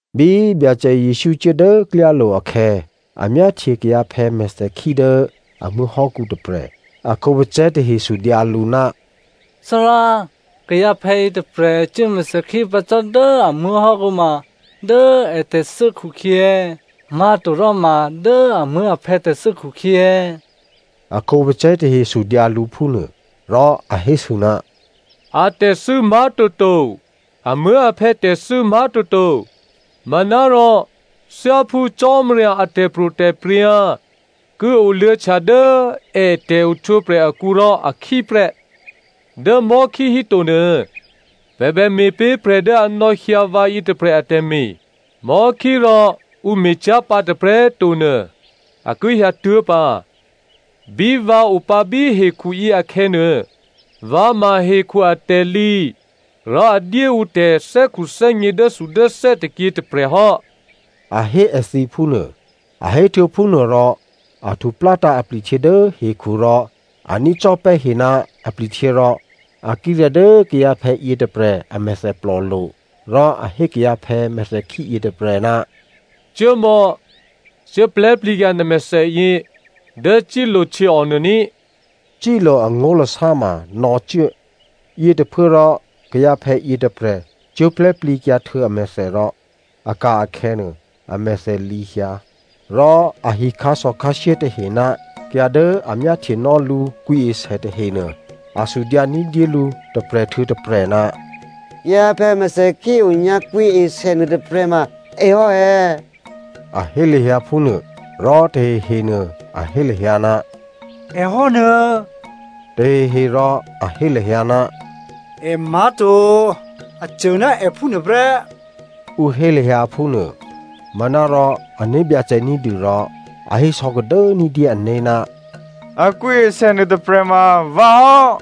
Bí Byacè Jesǔ cuố dố klyálo̤ akhè̌, a myáhtye kayǎphè̌ mèthèkhí dố a muố̤hò́kǔ tôprè̤. A khǒpacè̤̌ tahe sudyǎ lǔ, “Thárá, kayǎphè̌ yětôprè̤ cuố mèthèkhí pǎ cò́ dố a muố̤hò́kǔ ma, dố ètè̤thû́ khukhyě è̌, má̤toròma, dố amuố̤aphè̌ tè̤thû́ khukhyě è̌?” A khǒpacè̤̌ tahe sudyǎ lǔ phúnuô. Rò a hésû, “A tè̤thû́ má̤toto, amuố̤aphè̌ tè̤thû́ má̤toto. Manárò thyáphú Cò́marya a tè̤pro̤tè̤prya̤ ki oluô̌htya dố è tè̤ohtwǒprè̤ akǔ rò a khí prè́. Dǎ mò̤́khí híto nuô, pè̤ bè me̤ pé̤ prè̤ dố a nò̌hyǎ vǎ yětôprè̤ atè̤me̤. Mò̤́khí rò ǔ me̤cyá̤ pǎ tôprè̤꤮ to nuô, a ki hyǎtuố̤ pǎ. Bí vǎ opǎ bí hekhuyě akhè̌nuô, vǎ ma hekhu atè̤lǐ rò a dyé ǔ tè̤thè́khuthè́gně dốthudốthè́ tôkyě tôprè̤ hò́,” a hé èthǐ phúnuô. A héhtuô̌ phúnuô rò, a htuplátǎ̤ apli̤htyě dố hekhu rò a nícò́pè́ he ná apli̤htyě rò a kírè̤̌ dố kayǎphè̌ yětôprè̤ a mèthèplò lo̤. Rò a hé kayǎphè̌ mèthèkhí yětôprè̤, “Cuốmò̌, cuố plè̤́plǐkyǎ nè̤ mèthèyě dố Siloa htyěò nuô ní꤮” (Siloa angó̤lasá ma “nò̌cuố”). Yětôphuốrò kayǎphè̌ yětôprè̤ cuố plè̤́plǐkyǎ htuô̌ amèthè, rò a ka̤ akhè̌nuô, a mèthè lǐ hyǎ. Rò ahi khǎsò̌khǎshyé tahe ná kayǎ dố a myáhtyenò́ lǔ kwǐesè tahenuô, a sudyǎ ní̤dyé lǔ tôprè̤ htuô̌ tôprè̤, “Kayǎphè̌ mèthèkhí onyǎ kwǐesè nuôtôprè̤ ma èhò́ è̌?” A hé lahyǎ phúnuô. Rò tahehe nuô, a hé lahyǎ, “È hò́nuô̌.” Tahehe rò a hé lahyǎ, “È má̤to, a cô ná è phúnuôprè́,” ǔ hé lahyǎ phúnuô. Manárò ané̤byacè ní̤dû rò, a hé sò̌kadố ní̤dyé ané̤, “A kwǐesè nuôtôprè̤ ma vǎhò́,”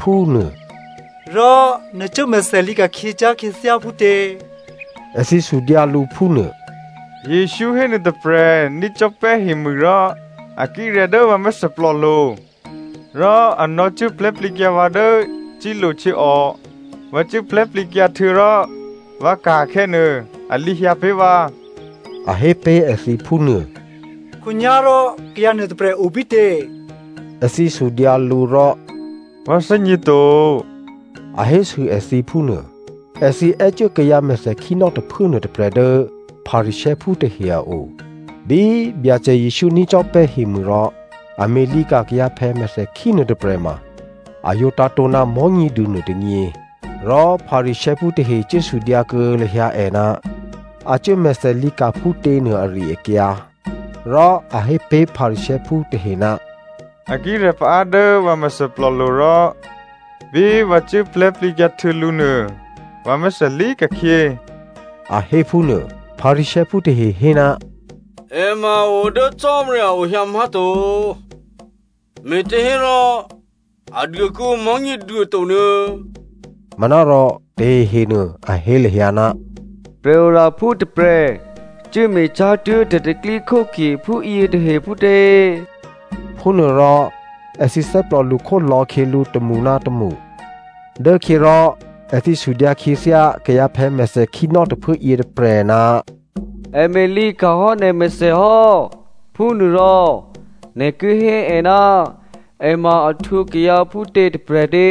phúnuô. “Rò nè̤ cuố mèthèlǐ ka̤khyě cyá̤ khyěthyá phútě?” Èthǐ sudyǎ lǔ phúnuô. “Jesǔ hé nuôtôprè̤ nícò́pè́ hemû rò a kírè̤̌ dố vǎ mèthèplòlo̤. Rò a nò̌cuố plè̤́plǐkyǎ vǎ dố Siloa htyěò. Vǎ cuố plè̤́plǐkyǎ htuô̌ rò vǎ ka̤ akhè̌nuô, a lǐhyǎ pé̤ vǎ,” a hé pé̤ èthǐ phúnuô. “Khǒnyá̤rò kayǎ nuôtôprè̤ obítě?” Èthǐ sudyǎ lǔ, rò. “Vǎ thè́gněto,” a hésû èthǐ phúnuô. Èthǐ è́cuố kayǎ mèthèkhínò́ tôphuố nuôtôprè̤ dố Pharisěophú tahe a o. Bí Byacè Jesǔ nícò́pè́ hemû rò a me̤lǐka̤ kayǎphè̌ mèthèkhí nuôtôprè̤ ma a yǒ tǎ̤tǒ ná Mò̤́nyěduô nuôtônyě. Rò Pharisěophú tahe cuố sudyǎkuô̌ lahyǎ è ná a cuố mèthèlǐ ka̤ phútě nuô ari-akyǎ. Rò a hé pé̤ Pharisěophú tahe, “A kírè̤̌ paá dố vǎ mèthèplòlo̤ rò bí vǎ cuố plè̤́plǐkyǎ htuô̌ lǔ nuô vǎ mèthèlǐ ka̤khyě,” a hé phúnuô. Pharisěophú tahe hé, “È ma a o dố Cò́marya a o hyǎ má̤to, me̤těhérò a duô kuô̌ǔ Mò̤́nyěduô to nuô̌꤮.” Manárò tahehenuô a hé lahyǎ, “Prè̤oraphú tôprè̤ cuốme̤ cyá̤ tuố̤ tè̤pro̤tè̤prya̤ phúyě tahe phútě?” Phúnuôrò èthǐ thè́plò lṳkhó lò̌khyělǔ tômṳ ná tômṳ. Dốkhyě rò èthǐ sudyǎ khyěthyá kayǎphè̌ mèthèkhínò́ tôphuố yětôprè̤, “È me̤ lǐ ka̤hò́ nè̤ mèthè hò́, phúnuôrò nè̤ ki hé è ná è ma a htwǒ kayǎ phútě tôprè̤ tě?”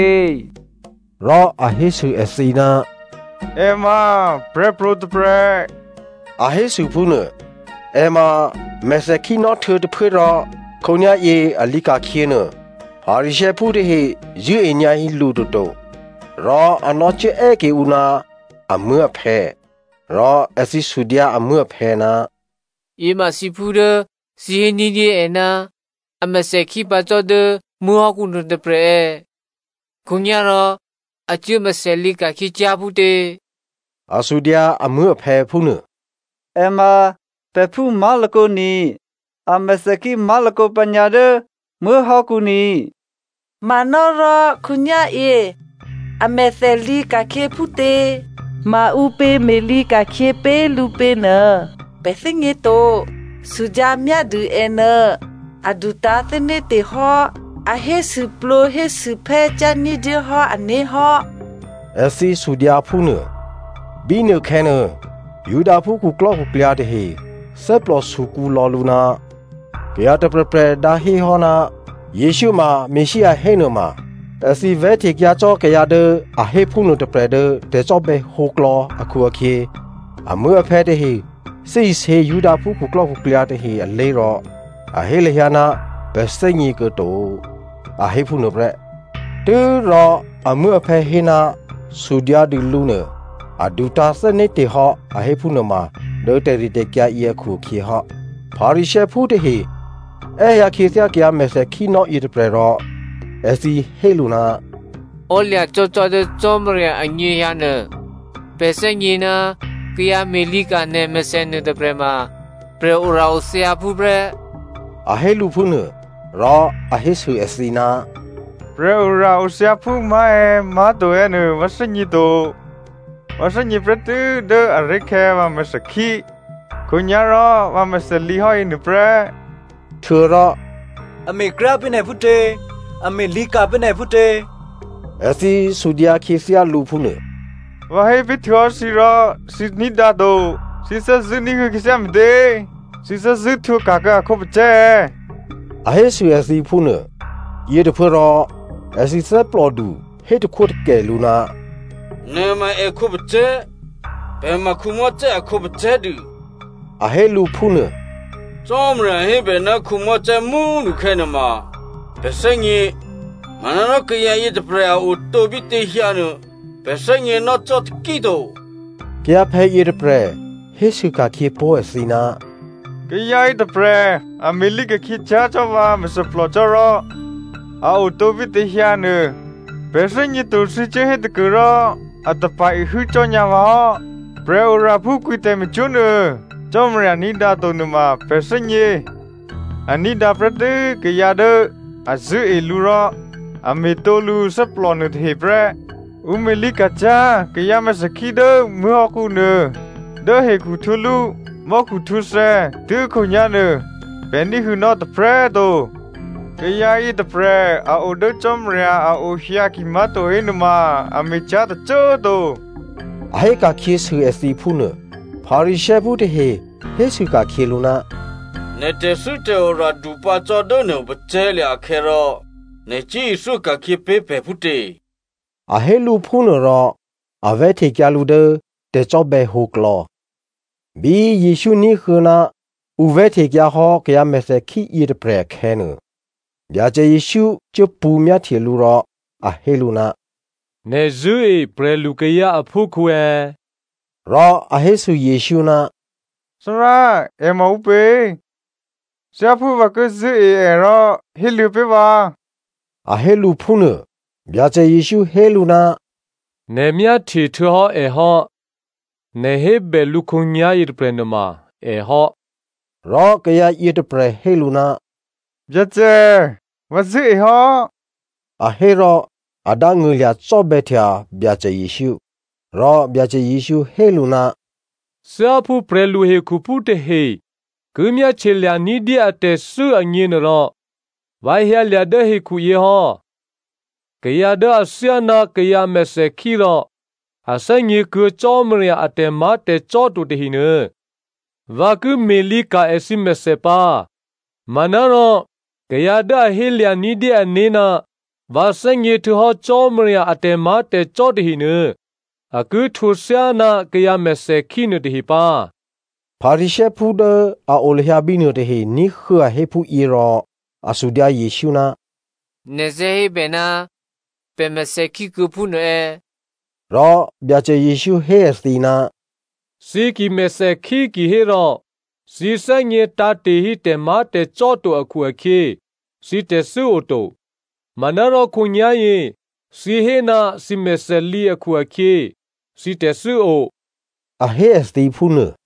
Rò a hésû èthǐ, “È ma prè̤pro̤ tôprè̤,” a hésû phúnuô. È ma mèthèkhínò́ htuô̌tôphuố rò khǒnyá̤yě a lǐ ka̤khyě nuô, Pharisěophú tahe zṳ̂́e nyǎ hí lǔ toto, rò a nò̌cuố è́ ke ǔ ná amuố̤aphè̌. Rò èthǐ sudyǎ amuố̤aphè̌, “Yěma thǐphú dố thǐ hé ní̤dyé è ná a mèthèkhí pǎ cò́ dố muố̤hò́kǔ nuôtôprè̤ è̌? Khǒnyá̤rò a cuố mèthèlǐ ka̤khyě cyá̤ phútě?” A sudyǎ amuố̤aphè̌ phúnuô. “È ma pè̤phú má̤lakǒ ni. A mèthèkhí má̤lakǒ pǎnyǎ dố muố̤hò́kǔ ni. Manárò khǒnyá̤yě, a mèthè lǐka̤khyě phútě, maǔpě me̤lǐ ka̤khyě pé̤ lǔ pě nuô pè̤ thè́gněto. Sudyǎ myádû ènuô. A dutǎ̤thè́né̤te̤ hò́. A hésûplǒ hésûphè́ cyá̤ ní̤dyéhò́ ané̤hò́,” èthǐ hésû phúnuô. Bínuôkhè̌ nuô, Judaphú khuklò́khuklyǎ tahe thè́plò sukǔ lò̌ lǔ, kayǎ tôprè̤prè̤ dǎhéhò́ ná Jesǔ ma Messia hénuôma, èthǐ vè̤́htekyǎ cò́ kayǎ dố a hé phúnuô tôprè̤ dố tè̤cò́bè̌ hǒklò̌ akhu-akhyě, amuố̤aphè̌ tahe thè́isě Judaphú khuklò́khuklyǎ tahe alé̤ rò, a hé lahyǎ ná pè̤ thè́gněkuô̌ to, a hé phúnuô prè́. Tû́rò amuố̤aphè̌ hé, “Sudyǎdû lǔ nuô, a dutǎ̤thè́né̤te̤ hò́,” a hé phúnuôma dố tè̤ritè̤kyǎ yě akhu-akhyě hò́. Pharisěophú tahe è́hyǎ khyěthyá kayǎ mèthèkhínò́ yětôprè̤ rò èthǐ hé lǔ, “Ò́lya̤cò́cò́ dố Cò́marya anyěhyǎ nuô, pè̤ thè́gně ná kayǎ me̤lǐka̤ nè̤ mèthè nuôtôprè̤ ma prè̤ora-othyǎphú prè́,” a hé lǔ phúnuô. Rò a hésû èthǐ, “Prè̤ora-othyǎphú má̤ è̌, má̤to è̌ nuô vǎ thè́gně to. Vǎ thè́gně prè́tû́ dố aré̤khè̌ vǎ mèthèkhí, khǒnyá̤rò vǎ mèthèlǐ hò́ yěnuô prè́.” Htuô̌rò “È me̤kryá꤮ pé̤ nè̤ phútě? A me̤ lǐka̤ pé̤ nè̤ phútě?” Èthǐ sudyǎ khyěthyá lǔ phúnuô. “Vǎ hé pé̤htuô̌hò́ thǐ rò thǐ ní̤dǎ to. Thǐ thè́zṳ̂́ ní̤huô̌ khyěthyá me̤tě? Thǐ thè́zṳ̂́ htwǒka̤kuô̌ a khǒpacè̤̌ è̌?” A hésû èthǐ phúnuô. Yětôphuốrò, èthǐ thè́plòdu, hé takhwótakè lǔ, “Nè̤ ma èkhǒpacè̤̌. Pè̤ ma Mosè a khǒpacè̤̌ dû,” a hé lǔ phúnuô. “Cò́marya hébè ná Mosè mú꤮ nukhè̌ nuôma pè̤ thè́gně. Manárò kayǎ yětôprè̤, a otǒ bítěhyǎ nuô pè̤ thè́gněnò́ cò́ taki꤮ to.” Kayǎphè̌ yětôprè̤ hésû ka̤khyě pó̤ èthǐ, “Kayǎ yětôprè̤ a me̤lǐ ka̤khyě cyá̤ cò́ vǎ mèthèplò cò́ rò, a otǒ bítěhyǎ nuô pè̤ thè́gněto thǐ cuốhé tôkuôrò a tapa̤-ihû́ cò́nyǎ vǎhò́. Prè̤oraphú kwǐ tè̤me̤cwó̤ nuô, Cò́marya ní̤dǎ to nuôma pè̤ thè́gně. A ní̤dǎprè́ tû́ kayǎ dố a zṳ̂́e lǔ rò a me̤tǒ lǔthè́plò nuôtahe prè́. Ǔ me̤lǐ ka̤ cyá̤ kayǎ mèthèkhí dố muố̤hò́kǔ nuô dố hekhu htwǒlú mò́khu htwǒthè̌ tuố̤khǒnyá̤ nuô pè̤ ní̤huô̌nò́ tôprè̤꤮ to. Kayǎ yětôprè̤ a odố Cò́marya a ohyǎ kimá̤to hénuôma, a me̤cyá̤ tôcô꤮ to,” a hé ka̤khyěsû èthǐ phúnuô. Pharisěophú tahe hésû ka̤khyě lǔ, “Nè̤ tè̤thû́tè̤ora dupǎ cò́ dố nè̤ opacè̤̌lya̤ akhè̌ rò nè̤ cuố ithyó ka̤khyě pé̤ pè̤ phútě?” A hé lǔ phúnuôrò a vè̤́htekyǎ lǔ dố tè̤cò́bè̌ hǒklò̌. Bí Jesǔ ní̤huô̌ ná ǔ vè̤́htekyǎhò́ kayǎ mèthèkhí yětôprè̤ akhè̌nuô, Byacè Jesǔ cuốpṳ̌ myáhtye lǔ rò a hé lǔ, “Nè̤ zṳ̂́e prè̤lukayǎ aphúkhǔ è̌?” Rò a hésû Jesǔ, “Thárá, è ma ǔpě? Thyáphú vǎ ki zṳ̂́e è rò héluô̌ pé̤ vǎ,” a hé lǔ phúnuô. Byacè Jesǔ hé lǔ, “Nè̤ myáhtye htuô̌hò́ è hò́. Nè̤ hébè lǔ khǒnyá̤ yětôprè̤ nuôma è hò́.” Rò kayǎ yětôprè̤ hé lǔ, “Byacè, vǎ zṳ̂́e hò́,” a hé rò a dángṳ̂lya̤ cò́bè̌htya Byacè Jesǔ. Rò Byacè Jesǔ hé lǔ, “Thyáphú prè̤lu hekhuphú tahe ki myáhtye lya̤ ní̤dyé atè̤thû́ agněnuôrò, vǎ hyǎlya̤ dố hekhuyě hò́. Kayǎ dố athyáná kayǎ mèthèkhí rò a thè́gněkuô̌ Cò́marya a tè̤má̤tè̤cò́ to tahenuô, vǎ ki me̤lǐ ka̤ èthǐ mèthè pǎ. Manárò kayǎ dố a hé lya̤ ní̤dyé ané̤ ná vǎ thè́gně htuô̌hò́ Cò́marya a tè̤má̤tè̤cò́ tahenuô, a ki htwǒ thyáná kayǎ mèthèkhí nuôtahe pǎ.” Pharisěophú dố a o lahyǎ bínuô tahe ní̤huô̌ a hé phúyě rò a sudyǎ Jesǔ, “Nè̤ thè́ hé pè̤ ná pè̤ mèthèkhí kuô̌ phúnuô è̌?” Rò Byacè Jesǔ hé èthǐ, “Thǐ ki mèthèkhí kihérò thǐ thè́gně tǎ̤te̤hí tè̤má̤tè̤cò́ to akhu-akhyě thǐ tè̤thû́ oto. Manárò khǒnyá̤yě thǐ hé ná thǐ mèthèlǐ akhu-akhyě, thǐ tè̤thû́o,” a hé èthǐ phúnuô.